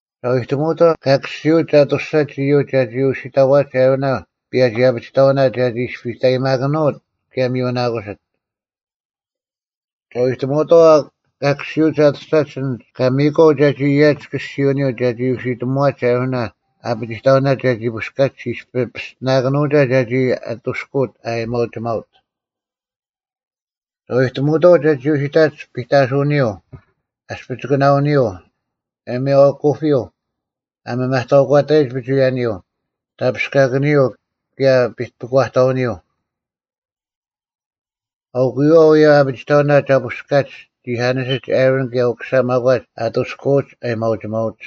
ᒐ ᐎᑎᒧᐅᑥᐤ ᑲ ᑭᔅᒋᐅᒡ ᐊᑐᔅᒐᒡ ᐃᔪᒡ ᒐᒋ ᐅᓯᑕᐛᒡ ᐊᕋᓇ ᐸᔭᒋ-ᐊᐱᒋᑕᐅᓇ ᒐᒋ ᐃᔅᐱᑕᔨᒪᑭᓄᐅᑦ ᑭᔭ ᒥᔪᓇᑯᓯᑦ᙮ ᒐ ᐎᑎᒧᐅᑥᐤ ᑲ ᑭᔅᒋᐅᒡ ᐊᑐᔅᒐᒡ ᐊᓐᒡ ᑲ ᒥᔨᑲᐤ ᒐᒋ ᐊᔭᒡ ᑭᔅᒋᐅᓂᔪᐤ ᒐᒋ ᐅᓯᑎᒧᐛᒡ ᐊᕋᓇ ᐊᐱᒋᑕᐅᓇ ᒐᒋ ᐳᔅᑲᐧᒃ ᐃᔅᐱᔾ ᐱᔅᑎᓇᑭᓄᐅᒐ ᒐᒋ ᐊᑐᔅᑯᐅᑦ ᐊ ᐊᔭᒥᐊᐅᒋᒪᐅᑦ᙮ ᒐ ᐎᑎᒧᐅᑥᐤ ᒐᒋ ᐅᓯᑕᒡ ᐱᑕᓱᐅᓂᔪᐤ, ᐊᔅᐱᒋᑯᓇᐅᓂᔪᐤ, ᐊᔭᒥᐊᐤ ᐊᑯᐱᔪᐤ, ᐊ ᒥᒪᑕᐅᒂᑕᔨᒡ ᐱᒍᐎᔭᓂᔪᐤ, ᑕᐱᔅᑲᑭᓂᔪᐤ, ᑭᔭ ᐱᒂᑕᐅᓂᔪᐤ᙮ ᐊᐅᑯᔪᐛ ᐅᔭ ᐊᔭᒥᐊᐅ-ᐊᐱᒋᑕᐅᓇ ᒐ ᐳᔅᑲᒡ ᒋᐧᑲᓂᔅ ᐊᕋᓐ ᑭᔭ ᐅᑯᓴ ᒪᒂᒡ ᐊᑐᔅᑯᐅᒡ ᐊᔭᒥᐊᐅᒋᒪᐅᒡ᙮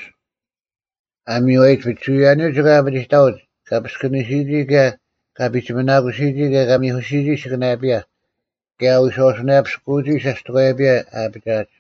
ᐊ ᒥᔽᔨᒡ ᐱᒍᐎᔭᓂᔪᐤ ᒋᑭ ᐊᐱᒋᑕᐅᒡ, ᑲ ᐱᔅᑭᓂᓯᔨᒋ ᑭᔭ ᑲ ᐱᒋᒥᓇᑯᓯᔨᒋ ᑭᔭ ᑲ ᒥᐧᑯᓯᔨᒋ ᐊᓯᑭᓇᔭᐱᔭ, ᑭᔭ ᐊ ᐎᔄᐅᓱᓇᔭᐱᔅᑯᔨᒋ ᓴᔅᑎᒂᔭᐱᔭ ᐊ ᐊᐱᒋᐊᒡ᙮”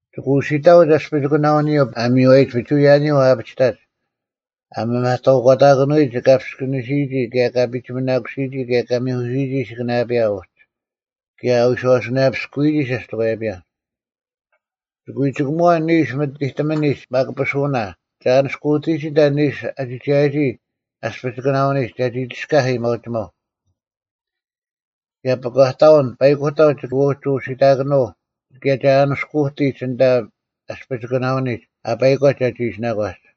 “ᒋᑭ ᐅᓯᑕᐅᒡ ᐊᔅᐱᒋᑯᓇᐅᓂᔪᐤ ᐊ ᒥᔽᔨᒡ ᐱᒍᐎᔭᓂᔪᐤ ᐊ ᐊᐱᒋᑕᒡ, ᐊ ᒥᒪᑕᐅᒂᑕᑭᓄᐎᔨᒡ ᑲ ᐱᔅᑭᓂᓯᔨᒋ ᑭᔭ ᑲ ᐱᒋᒥᓇᑯᓯᔨᒋ ᑭᔭ ᑲ ᒥᐧᑯᓯᔨᒋ ᐊᓯᑭᓇᔭᐱᔭ ᐅᒡ, ᑭᔭ ᐊ ᐎᔄᐅᓱᓇᔭᐱᔅᑯᔨᒋ ᓴᔅᑎᒂᔭᐱᔭ᙮ ᒋᑭ ᐎ ᒋᑭᒧᐛ ᓂᓱ ᒥᑎᑎᒥᓂᒡ ᒪᑯᐱᓱᐅᓇ ᒐ ᐊᓂᔅᑯᑎᒋ ᐊᓐᑕ ᓂᓱ ᐊ ᒋᒐᔭᒋ ᐊᔅᐱᒋᑯᓇᐅᓂᒡ ᒐᒋ ᒋᔅᑲᐧᒃ ᐊᔭᒥᐊᐅᒋᒪᐤ᙮ ᑭᔭ ᐱᒂᑕᐅᓐ ᐸᐃᑯᑕᐤ ᒋᑭ ᐅᒋ ᐅᓯᑕᑭᓄᐤ ᑭᔭ ᒐ ᐊᓂᔅᑯᑎᒡ ᐊᓐᑕ ᐊᔅᐱᒋᑯᓇᐅᓂᒡ ᐊ ᐸᐃᒂᒡ ᒐᒋ ᐃᓯᓇᒂᒡ᙮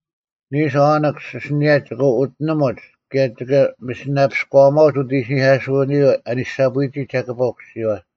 ᓂᓱ ᐅᓂᒃᔅ ᐊᓯᓂᔭ ᒋᑭ ᐅᑎᓂᒧᒡ ᑭᔭ ᒋᑭ ᒥᓯᓂᐱᔎᐊᒺᐅᒡ ᐅᑦ ᐃᓯᓂᐧᑲᓱᓂᔨᐛ ᐊᓂᓴᐳᐎᒋ ᒐᑭᐸ ᐅᑯᓯᔨᐛ᙮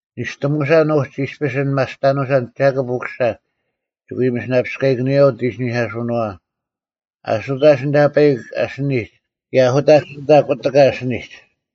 ᓂᔅᑎᒧᓴᓐ ᐅᒡ ᐃᔅᐱᔅ ᐊᓐ ᒪᔅᑕᓄᓴᓐ ᒐᑭᑉ ᐅᑯᓴ ᒋᑭ ᐎ ᒥᓯᓂᐱᔎᐊᑭᓄᔪᐛ ᐅᑦ ᐃᓯᓂᐧᑲᓱᓄᐛᐛ, ᐊᓱᑕᒡ ᐊᓐᑕ ᐸᐃᒄ ᐊᓯᓂᒡ ᑭᔭ ᐊᓱᑕᒡ ᐊᓐᑕ ᑯᑎᑲ ᐊᓯᓂᒡ᙮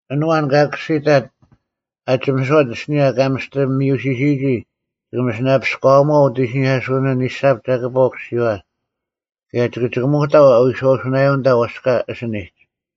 ᐊᓐ ᐊᐛᓐ ᑲᔅᒋᑕᑦ ᐊ ᒋᒥᔄᑦ ᐊᓯᓂᔭ ᑲ ᒥᔅᑎ ᒥᔪᓯᓯᔨᒋ ᒋᑭ ᒥᓯᓂᐱᔎᐊᒺᐤ ᐅᑦ ᐃᓯᓂᐧᑲᓱᓂᔨᐛ ᓂᓴᑉ ᒐᑭᐸ ᐅᑯᓯᔨᐛ, ᑭᔭ ᒋᑭ ᒋᑭᒧᑕᐤ ᐎᔄᐅᓱᓇᔭᔪᐤ ᐊᓐᑕ ᐛᔅᑲ ᐊᓯᓂᒡ᙮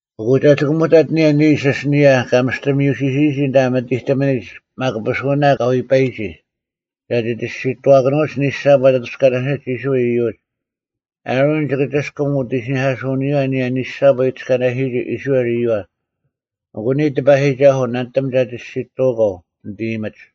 ᐊᑯ ᒐ ᒋᑭᒧᑕᑦ ᐊᓂᔭ ᓂᓱ ᐊᓯᓂᔭ ᑲ ᒥᔅᑎ ᒥᔪᓯᓯᔨᒋ ᐊᓐᑕ ᒥᑎᑎᒥᓂᒡ ᒪᑯᐱᓱᐅᓇ ᑲ ᐎᐸᔨᒋ, ᒐᒋ ᒋᔅᒋᑐᐛᑭᓄᐅᒡ ᓂᓴᑉ ᐊᑕᑐᔅᑲᓇᓯᒡ ᐃᔅᕋᐃᓪ ᐃᔪᒡ᙮ ᐊᕋᓐ ᒋᑭ ᒋᔅᑭᒻ ᐅᑦ ᐃᓯᓂᐧᑲᓱᓂᔨᐛ ᐊᓂᔭ ᓂᓴᑉ ᐊ ᐃᑎᔅᑲᓇᓯᔨᒋ ᐃᔅᕋᐃᓪ ᐃᔪᐛ ᐊᑯ ᓂᔾ ᑎᐸᔨᒋᒐᓱᐤ ᓇᓂᑎᒻ ᒐ ᒋᔅᒋᑐᐅᒂᐤ ᓂᑦ ᐃᔨᒥᒡ᙮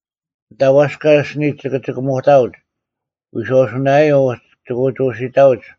ᐊᓐᑕ ᐛᔅᑲ ᐊᓯᓂᒡ ᒋᑭ ᒋᑭᒧᑕᐅᒡ, ᐎᔄᐅᓱᓇᔭᐤ ᐅᒡ ᒋᑭ ᐅᒋ ᐅᓯᑕᐅᒡ,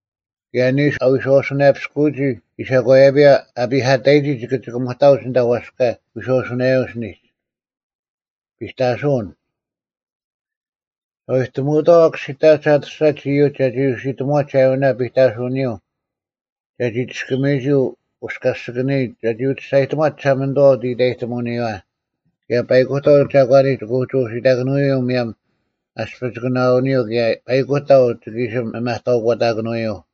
ᑭᔭ ᓂᓱ ᐊ ᐎᔄᐅᓱᓇᔭᐱᔅᑯᔨᒋ ᐃᓴᒂᔭᐱᔭ ᐊ ᐱᐧᑲᑕᔨᒋ ᒋᑭ ᒋᑭᒧᑕᐅᒡ ᐊᓐᑕ ᐛᔅᑲ ᐎᔄᐅᓱᓇᔭᐤ ᐊᓯᓂᒡ᙮” “ᒐ ᐎᑎᒧᐅᑥᐤ ᐊ ᑭᔅᒋᑕᒡ ᐊᑐᔅᒐᒡ ᐃᔪᒡ ᒐᒋ ᐅᓯᑎᒧᐛᒡ ᐊᕈᓇ ᐱᑕᓱᐅᓂᔪᐤ ᒐᒋ ᒋᔅᑭᒥᔨᒋ ᐅᔅᑲᔅᒋᑭᓂᔨᒡ ᒐᒋ ᐅᒋ ᒋᔅᒐᔨᑎᒺᑦ ᒋᓴᒪᓂᑐᐛ ᐅᑦ ᐃᑕᔨᑎᒧᐅᓂᔨᐛ, ᑭᔭ ᐸᐃᑯᑕᐤ ᒐᒂᓂᒡ ᒋᑭ ᐅᒋ ᐅᓯᑕᑭᓄᐅᔪᐤ ᒧᔭᒻ ᐊᔅᐱᒋᑯᓇᐅᓂᔪᐤ ᑭᔭ ᐸᐃᑯᑕᐤ ᒋᑭ ᐃᓯ ᒥᒪᑕᐅᒂᑕᑭᓄᐎᔪᐤ᙮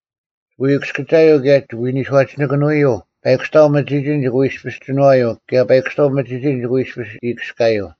ᒋᑭ ᐎ ᑭᔅᑭᒐᔪᐤ ᑭᔭ ᒋᑭ ᐎ ᓂᔄᒋᓇᑭᓄᐅᔪᐤ ᐸᐃᑯᔅᑕᐤ ᒥᒋᒋᓐ ᒋᑭ ᐎ ᐃᔅᐱᔅ ᒋᓏᔪᐤ ᑭᔭ ᐸᐃᑯᔅᑕᐤ ᒥᒋᒋᓐ ᒋᑭ ᐎ ᐃᔅᐱᔅ ᐃᔅᑭᔅᑲᔪᐤ᙮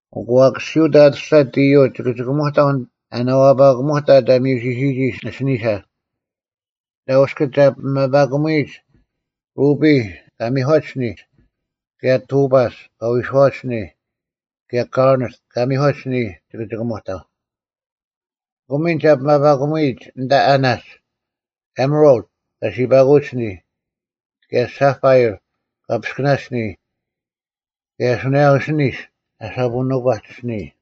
ᐊᑯ ᐊ ᑭᔅᒋᐅᑦ ᐊᑐᔅᒐᑦ ᐃᔪᐤ ᒋᑭ ᒋᑭᒧᑕᐤ ᐊ ᓇᐛᐸᑭᒧᑕᑦ ᐊ ᒥᔪᓯᓯᔨᒋ ᐊᓯᓂᓴ᙮ ᐊᓐᑕ ᐅᔅᑭᒡ ᒐ ᐱᒪᐸᑯᒧᐎᔨᒡ ᕈᐱᔾ (ᑲ ᒥᒂᒡ ᐊᓯᓂᔾ), ᑭᔭ ᑐᐸᔅ (ᑲ ᐎᔄᐛᒡ ᐊᓯᓂᔾ), ᑭᔭ ᑲᕐᓂᑦ (ᑲ ᒥᒂᒡ ᐊᓯᓂᔾ) ᒋᑭ ᒋᑭᒧᑕᐤ᙮ ᐊᑯ ᒥᓐ ᒐ ᐱᒪᐸᑯᒧᐎᔨᒡ ᐊᓐᑕ ᐊᓇᒡ, ᐊᒥᕋᓪᑦ (ᑲ ᓯᐸᑯᐅᒡ ᐊᓯᓂᔾ), ᑭᔭ ᓴᐸᐃᕐ (ᑲ ᐱᔅᑭᓇᒡ ᐊᓯᓂᔾ), ᑭᔭ ᓱᓇᔭᐤ ᐊᓯᓂᔅ (ᐊ ᓴᐳᓄᒂᒡ ᐊᓯᓂᔾ)᙮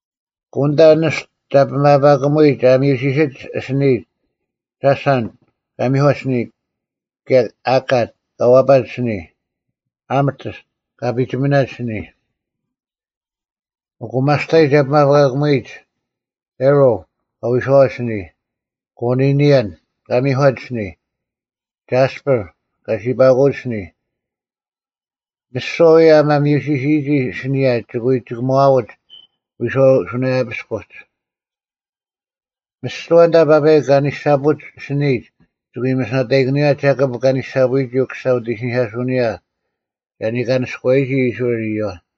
ᐊᑯ ᐊᓐᑕ ᓂᔅᑐ ᒐ ᐱᒪᐸᑯᒧᐎᔨᒡ ᐊ ᒥᔪᓯᓯᒡ ᐊᓯᓂᔨᒡ ᒐᓴᓐᑦ (ᑲ ᒥᒂᒡ ᐊᓯᓂᔾ), ᑭᔭ ᐊᑲᑦ (ᑲ ᐛᐸᒡ ᐊᓯᓂᔾ), ᑭᔭ ᐊᒪᑎᔅᑦ (ᑲ ᐱᒋᒥᓇᒡ ᐊᓯᓂᔾ)᙮ ᐊᑯ ᒪᔅᑕᔾ ᒐ ᐱᒪᐸᑯᒧᐎᔨᒡ ᐸᕆᓪ (ᑲ ᐎᔄᐛᒡ ᐊᓯᓂᔾ), ᑲᕐᓂᓕᔭᓐ (ᑲ ᒥᒂᒡ ᐊᓯᓂᔾ), ᒐᔅᐳᕐ (ᑲ ᓯᐸᑯᐅᒡ ᐊᓯᓂᔾ)᙮ ᒥᓯᐛ ᐅᔭ ᐊ ᒥᔪᓯᓯᔨᒋ ᐊᓯᓂᔭ ᒋᑭ ᐎ ᒋᑭᒺᐅᒡ ᐎᔄᐅᐤ ᓯᑭᓇᔭᐱᔅᑯᒡ᙮ ᒥᓯᐛ ᐊᓐᑕ ᐸᐸᐃᒄ ᐊᓂᓴᐳᒡ ᐊᓯᓂᔨᒡ ᒋᑭ ᐎ ᒥᓯᓇᑕᐃᑭᓄᔪᐛ ᒐᑭᑉ ᑲ ᓂᓴᐳᔨᒋ ᐅᑯᓴ ᐅᑦ ᐃᓯᓂᐧᑲᓱᐅᓂᔨᐛ ᒐ ᓂᑲᓂᔅᑯᐛᔨᒋ ᐃᔅᕋᐃᓪ ᐃᔪᐛ᙮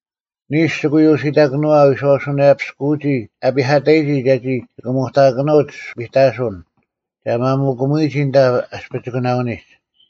ᓂᓱ ᒋᑭ ᐎ ᐅᓯᑕᑭᓄᐛ ᐊ ᐎᔄᐅᓱᓇᔭᐱᔅᑯᐅᒋ ᐃᓴᒂᔭᐱᔭ ᐊ ᐱᐧᑲᑕᔨᒋ ᒐᒋ ᒋᑭᒧᑕᑭᓄᐅᒡ ᐱᑕᓱᓐ᙮ ᒐ ᒪᒧᑭᒧᐎᔨᒋ ᐊᓐᑕ ᐊᔅᐱᒋᑯᓇᐅᓂᒡ᙮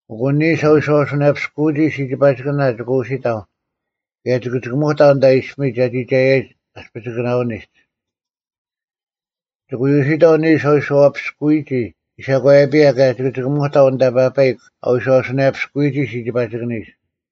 ᐊᑯ ᓂᓱ ᐊ ᐎᔄᐅᓱᓇᔭᐱᔅᑯᔨᒋ ᓯᒋᐸᒋᑭᓇ ᒋᑭ ᐅᓯᑕᐤ ᑭᔭ ᒋᑭ ᒋᑭᒧᑕᐤ ᐊᓐᑕ ᐃᔅᐱᒥᒡ ᐊ ᒋᒐᔭᔨᒡ ᐊᔅᐱᒋᑯᓇᐅᓂᒡ᙮ ᒋᑭ ᐎ ᐅᓯᑕᐤ ᓂᓱ ᐊ ᐎᔄᐛᐱᔅᑯᔨᒋ ᐃᓴᒂᔭᐱᔭ ᑭᔭ ᒋᑭ ᒋᑭᒧᑕᐤ ᐊᓐᑕ ᐸᐸᐃᒄ ᐊ ᐎᔄᐅᓱᓇᔭᐱᔅᑯᔨᒋ ᓯᒋᐸᒋᑭᓂᒡ᙮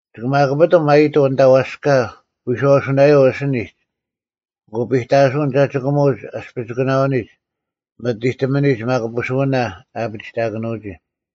ᒋᑭ ᒪᑯᐱᑎᒻ ᐊᔨᑐᐤ ᐊᓐᑕ ᐛᔅᑲ ᐎᔄᐅᓱᓇᔭᐤ ᐊᓯᓂᒡ ᐊᑯ ᐱᑕᓱᐅᓐ ᒐ ᒋᑭᒧᒡ ᐊᔅᐱᒋᑯᓇᐅᓂᒡ ᒥᑎᑎᒥᓂᒡ ᒪᑯᐱᓱᐅᓇ ᐊᐱᒋᑕᑭᓄᐅᒋ᙮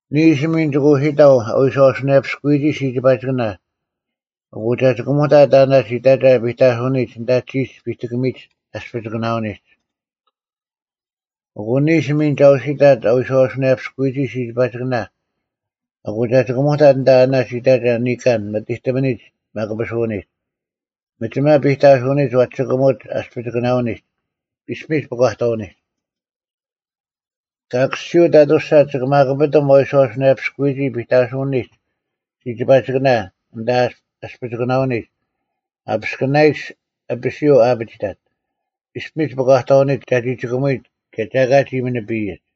ᓂᓱ ᒥᓐ ᒋᑭ ᐅᓯᑕᐤ ᐊ ᐎᔄᐅᓱᓇᔭᐱᔅᑯᔨᒋ ᓯᒋᐸᒋᑭᓇ ᐊᑯ ᒐ ᒋᑭᒧᑕᑦ ᐊᓇᒡ ᐃᑕᒐ ᐱᑕᓱᐅᓂᒡ ᐊᓐᑕ ᒋᒡ ᐱᑎᑭᒥᒡ ᐊᔅᐱᒋᑯᓇᐅᓂᒡ᙮ ᐊᑯ ᓂᓱ ᒥᓐ ᒐ ᐅᓯᑕᑦ ᐊ ᐎᔄᐅᓱᓇᔭᐱᔅᑯᔨᒋ ᓯᒋᐸᒋᑭᓇ ᐊᑯ ᒐ ᒋᑭᒧᑕᑦ ᐊᓐᑕ ᐊᓇᒡ ᐃᑕᒐ ᓂᑲᓐ ᒥᑎᑎᒥᓂᒡ ᒪᑯᐱᓱᐅᓂᒡ, ᒥᒋᒪ ᐱᑕᓱᐅᓂᒡ ᐛᒋ ᒋᑭᒧᒡ ᐊᔅᐱᒋᑯᓇᐅᓂᒡ, ᐃᔅᐱᒥᒡ ᐱᒂᑕᐅᓂᒡ᙮ ᑲ ᑭᔅᒋᐅᑦ ᐊᑐᔅᒐᑦ ᒋᑭ ᒪᑯᐱᑎᒻ ᐊ ᐎᔄᐅᓱᓇᔭᐱᔅᑯᔨᒋ ᐱᑕᓱᐅᓂᒡ ᓯᒋᐸᒋᑭᓇ ᐊᓐᑕ ᐊᔅᐱᒋᑯᓇᐅᓂᒡ ᐊᐱᔅᑭᓇᔨᒡ ᐊᐱᓯᔪᐤ ᐊ ᐊᐱᑕᑦ, ᐃᔅᐱᒥᒡ ᐱᒂᑕᐅᓂᒡ ᒐᒋ ᒋᑭᒧᔨᒡ ᑭᔭ ᒐ ᐊᑲ ᒋ ᒥᓂᐱᔨᒡ᙮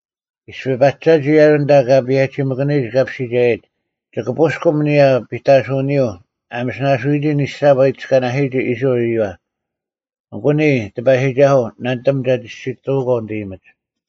ᐃᔅᐱ ᐸᒐᒋ ᐊᕋᓐ ᐊᓐᑕ ᑲ ᐸᔭᒋᒥᑭᓂᔨᒡ ᑲᐱᔅᒋᒐᔭᔨᒡ, ᒋᑭ ᐳᔅᑭᒻ ᐊᓂᔭ ᐱᑕᓱᐅᓂᔪᐤ ᐊ ᒥᓯᓇᓱᐎᔨᒋ ᓂᓴᑉ ᐊ ᐃᑎᔅᑲᓇᓯᔨᒋ ᐃᔅᕋᐃᓪ ᐃᔪᐛ᙮ ᐊᑯ ᓂᔾ ᑎᐸᔨᒋᒐᓱᐤ, ᓇᓂᑎᒻ ᒐ ᒋᔅᒋᑐᐅᒂᐤ ᓂᑦ ᐃᔨᒥᒡ᙮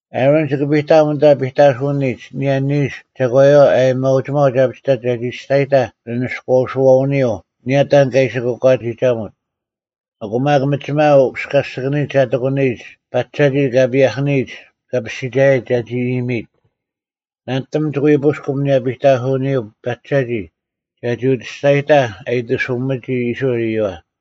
ᐊᕋᓐ ᒋᑭ ᐱᑕᐊᒻ ᐊᓐᑕ ᐱᑕᓱᐅᓂᒡ ᐊᓂᔭ ᓂᓱ ᒐᒂᔪᐛ ᐊᔭᒥᐊᐅᒋᒪᐤ ᒐ ᐊᐱᒋᑕᑦ ᒐᒋ ᒋᔅᒐᔨᑕᐧᒄ ᓂ ᓂᔎᐛᓯᐛᐅᓂᔪᐤ ᐊᓂᔭ ᑕᓐ ᑲ ᐃᓯ ᑯᒂᒋᒐᒧᑦ᙮ ᐊᑯ ᒪᒃ ᒥᒋᒪ ᐅᔅᑲᔅᒋᑭᓂᒡ ᒐ ᑎᑯᓂᔨᒡ ᐸᒐᒋ ᑲ ᐸᔭᒋᒥᑭᓂᔨᒡ ᑲᐱᔅᒋᒐᔭᔨᒡ ᒐᒋ ᐃᔨᒥᐃᑦ᙮ ᓇᓂᑎᒻ ᒋᑭ ᐎ ᐳᔅᑭᒻ ᐊᓂᔭ ᐱᑕᓱᐅᓂᔪᐤ ᐸᒐᒋ ᒐᒋ ᐅᒋ ᒋᔅᒐᔨᑕᐧᒃ ᐊ ᐃᑎᓱᒥᒋ ᐃᔅᕋᐃᓪ ᐃᔪᐛ᙮”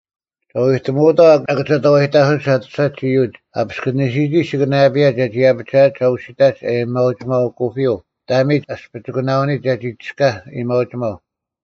“ᒐ ᐎ ᑎᒧᐅᑥᐤ ᐊᑭᒐᑕᐛᔨᑕᑯᓯᒡ ᐊᑐᔅᒐᒡ ᐃᔪᒡ ᐊ ᐱᔅᑭᓂᓯᔨᒋ ᓯᑭᓇᔭᐱᔭ ᒐᒋ ᐊᐱᒋᐊᒡ ᐊ ᐅᓯᑕᒡ ᐊᔭᒥᐊᐤ ᐊᑯᐱᔪᐤ ᑕᒥᒡ ᐊᔅᐱᒋᑯᓇᐅᓂᒡ ᒐᒋ ᒋᔅᑲᐧᒃ ᐊᔭᒥᐊᐅᒋᒪᐤ᙮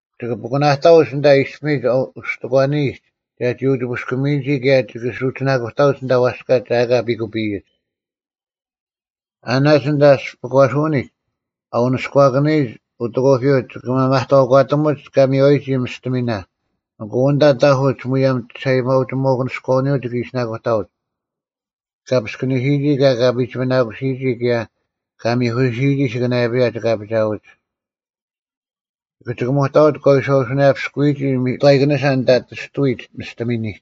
ᒋᑭ ᐱᑯᓇᑕᐅᒡ ᐊᓐᑕ ᐃᔅᐱᒥᒡ ᐅᔅᑎᒂᓂᔨᒡ ᒐᒋ ᐅᒋ ᐳᔅᑭᒥᔨᒋ ᑭᔭ ᒋᑭ ᓱᒋᓇᑯᑕᐅᒡ ᐊᓐᑕ ᐛᔅᑲ ᒐ ᐊᑲ ᐱᑯᐱᔨᒡ᙮ ᐊᓇᒡ ᐊᓐᑕ (ᐊᔅᐱᒂᓱᐅᓂᒡ) ᐊ ᐅᓂᔎᑭᓂᔨᒡ ᐅᑦ ᐊᑯᐱᔪᐤ ᒋᑭ ᒥᒪᑕᐅᒂᑎᒧᒡ ᑲ ᒥᒂᔨᒋ ᒥᔅᑎᒥᓇ ᐊᑯ ᐊᓐᑕ ᑕᐧᑯᒡ ᒧᔭᒻ ᒋᓴᐅᒋᒪᐅᑯᓂᔎᐅᓂᔪᐤ ᒋᑭ ᐃᓯᓇᑯᑕᐅᒡ᙮ ᑲ ᐱᔅᑭᓂᓯᔨᒋ ᑭᔭ ᑲ ᐱᒋᒥᓇᑯᓯᔨᒋ, ᑭᔭ ᑲ ᒥᐧᑯᓯᔨᒋ ᐊᓯᑭᓇᔭᐱᔭ ᒋᑭ ᐊᐱᒋᐊᐅᒡ᙮ ᒋᑭ ᒋᑭᒧᑕᐅᒡ ᑲ ᐎᔄᐅᓱᓇᔭᐱᔅᑯᔨᒋ ᒥᑥᐃᑭᓂᓴ ᐊᓐᑕ ᑎᔅᑐᐎᒡ ᒥᔅᑎᒥᓂᒡ᙮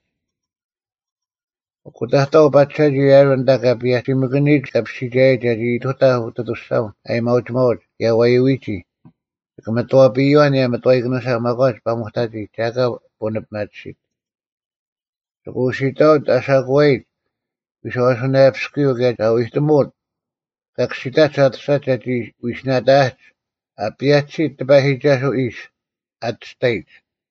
ᐊᑯ ᑕᑥᐤ ᐸᒐᒋ ᐊᕋᓐ ᐊᓐᑕ ᑲ ᐸᔭᒋᒥᑭᓂᔨᒡ ᑲᐱᔅᒋᒐᔭᔨᒡ ᒐᒋ ᐃᑐᑕᐧᒃ ᐅᑦ ᐊᑐᔅᒐᐅᓐ ᐊᔭᒥᐊᐅᒋᒪᐅᑦ ᑭᔭ ᐛᔪᐎᒋ, ᒋᑭ ᒥᑥᐱᔨᐛ ᐊᓂᔭ ᒥᑥᐃᑭᓂᓴ ᒪᒂᒡ ᐸᒧᑕᒋ ᒐ ᐊᑲ ᐳᓂᐱᒪᑎᓯᑦ᙮ ᒋᑭ ᐅᓯᑕᐅᒡ ᐊᓴᑯᐛᔨᒡ ᐎᔄᐅᓱᓇᔭᐱᔅᑯᔪᐤ ᑭᔭ ᒐ ᐎᑎᒧᐅᑦ ᑲ ᑭᔅᒋᑕᒡ ᐊᑐᔅᒐᒡ ᒐᒋ ᐎᓯᓇᑕᐊᒡ, “ᐊ ᐸᔭᒋᓯᑦ ᑎᐸᔨᒋᒐᓱᐛ ᐃᔅ,” ᐊᑎᔅᑕᔨᒡ᙮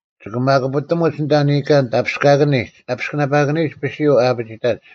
ᒋᑭ ᒪᑯᐱᑎᒧᒡ ᐊᓐᑕ ᓂᑲᓐ ᑕᐱᔅᑲᑭᓂᒡ ᐊᐱᔅᑭᓇᐸᑭᓂᔨᒡ ᐊᐱᓯᔪᐤ ᐊ ᐊᐱᒋᑕᒡ᙮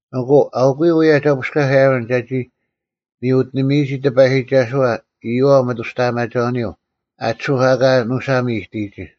ᐊᑯ ᐊᐅᑯᔪᐤ ᐅᔭ ᒐ ᐳᔅᑲᐧᒃ ᐊᕋᓐ ᒐᒋ ᒥᔪ ᐅᑎᓂᒥᔨᒋ ᑎᐸᔨᒋᒐᓱᐛ ᐃᔪᐛ ᐅᒥᑐᔅᑕᐊᒪᒐᐅᓂᔪᐛ ᐊᑎᓱᐧᒄ ᐊᑲ ᓄᓴᒻ ᐃᑎᔨᒋ᙮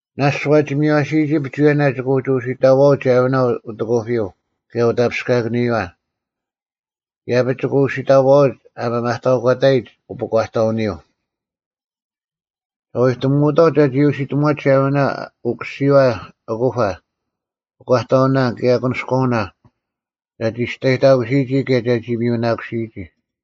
ᓇᔅᒡ ᐛᒋ ᒥᔽᓯᔨᒋ ᐱᒍᐎᔭᓇ ᒋᑭ ᐅᒋ ᐅᓯᑕᐛᐅᒡ ᐊᕋᓇ ᐅᑦ ᐊᑯᐱᔪᐤ ᑭᔭ ᐅᑕᐱᔅᑲᑭᓂᔨᐛ᙮ ᐃᔭᐱᒡ ᒋᑭ ᐅᓯᑕᐛᐅᒡ ᐊ ᒥᒪᑕᐅᒂᑕᔨᒡ ᐅᐱᒂᑕᐅᓂᔪᐤ᙮ ᒐ ᐎᑎᒧᐅᑥᐤ ᒐᒋ ᐅᓯᑎᒧᐛᒡ ᐊᕋᓇ ᐅᑯᓯᔨᐛ ᐊᑯᐸ, ᐱᒂᑕᐅᓇ, ᑭᔭ ᐊᑯᓂᔎᐅᓇ ᒐᒋ ᒋᔅᑕᔨᑕᑯᓯᔨᒋ ᑭᔭ ᒐᒋ ᒥᔪᓇᑯᓯᔨᒋ᙮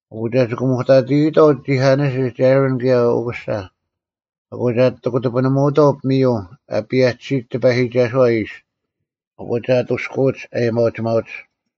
ᐊᑯ ᒐ ᒋᑭᒧᑕᑎᔨᑥᐤ ᒋᐧᑲᓂᔅ ᐊᕋᓐ ᑭᔭ ᐅᑯᓴ᙮ ᐊᑯ ᒐ ᐊᑎ ᑯᑎᐱᓂᒧᐅᑥᐤ ᐱᒥᔪᐤ ᐊ ᐸᔭᒋᓯᒡ ᑎᐸᔨᒋᒐᓱᐛ ᐃᔅ, ᐊᑯ ᒐ ᐊᑐᔅᑯᐅᒡ ᐊᔭᒥᐊᐅᒋᒪᐅᒡ᙮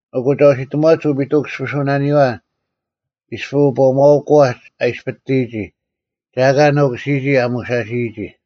ᐊᑯ ᒐ ᐅᓯᑎᒧᐛᒡ ᐅᐱᑐᔅᑭᒋᐱᓱᐅᓂᔨᐛ ᐃᔅᐱᔅ ᐅᑈᒪᐅᑯᐛᒡ ᐊ ᐃᔅᐱᑎᔨᒋ ᒐ ᐊᑲ ᓄᑯᓯᔨᒋ ᐊ ᒧᓴᓯᔨᒋ᙮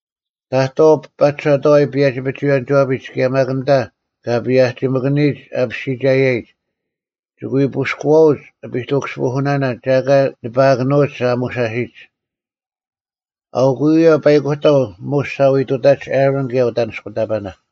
ᑕᑥᐤ ᐸᒐᑥᐎ ᐸᔭᒋ-ᐱᒍᐎᔭᓂᒋᐛᐱᒡ ᑭᔭ ᒪᒃ ᐊᓐᑕ ᑲ ᐸᔭᒋᒥᑭᓂᔨᒡ ᑲᐱᔅᒋᒐᔭᔨᒡ ᒋᑭ ᐎ ᐳᔅᑯᐛᐅᒡ ᐱᑐᑭᔅᒋᐱᓱᓇᓇ ᒐ ᐊᑲ ᓂᐸᐊᑭᓄᐅᒡ ᐊ ᒧᓴᓯᒡ᙮ ᐊᐅᑯᔪᐤ ᐅᔭ ᐸᐃᑯᑕᐤ ᒧᔅ ᒐ ᐎ ᑐᑕᒡ ᐊᕋᓐ ᑭᔭ ᐅᑦ ᐊᓂᔅᑯᑕᐸᓇ᙮”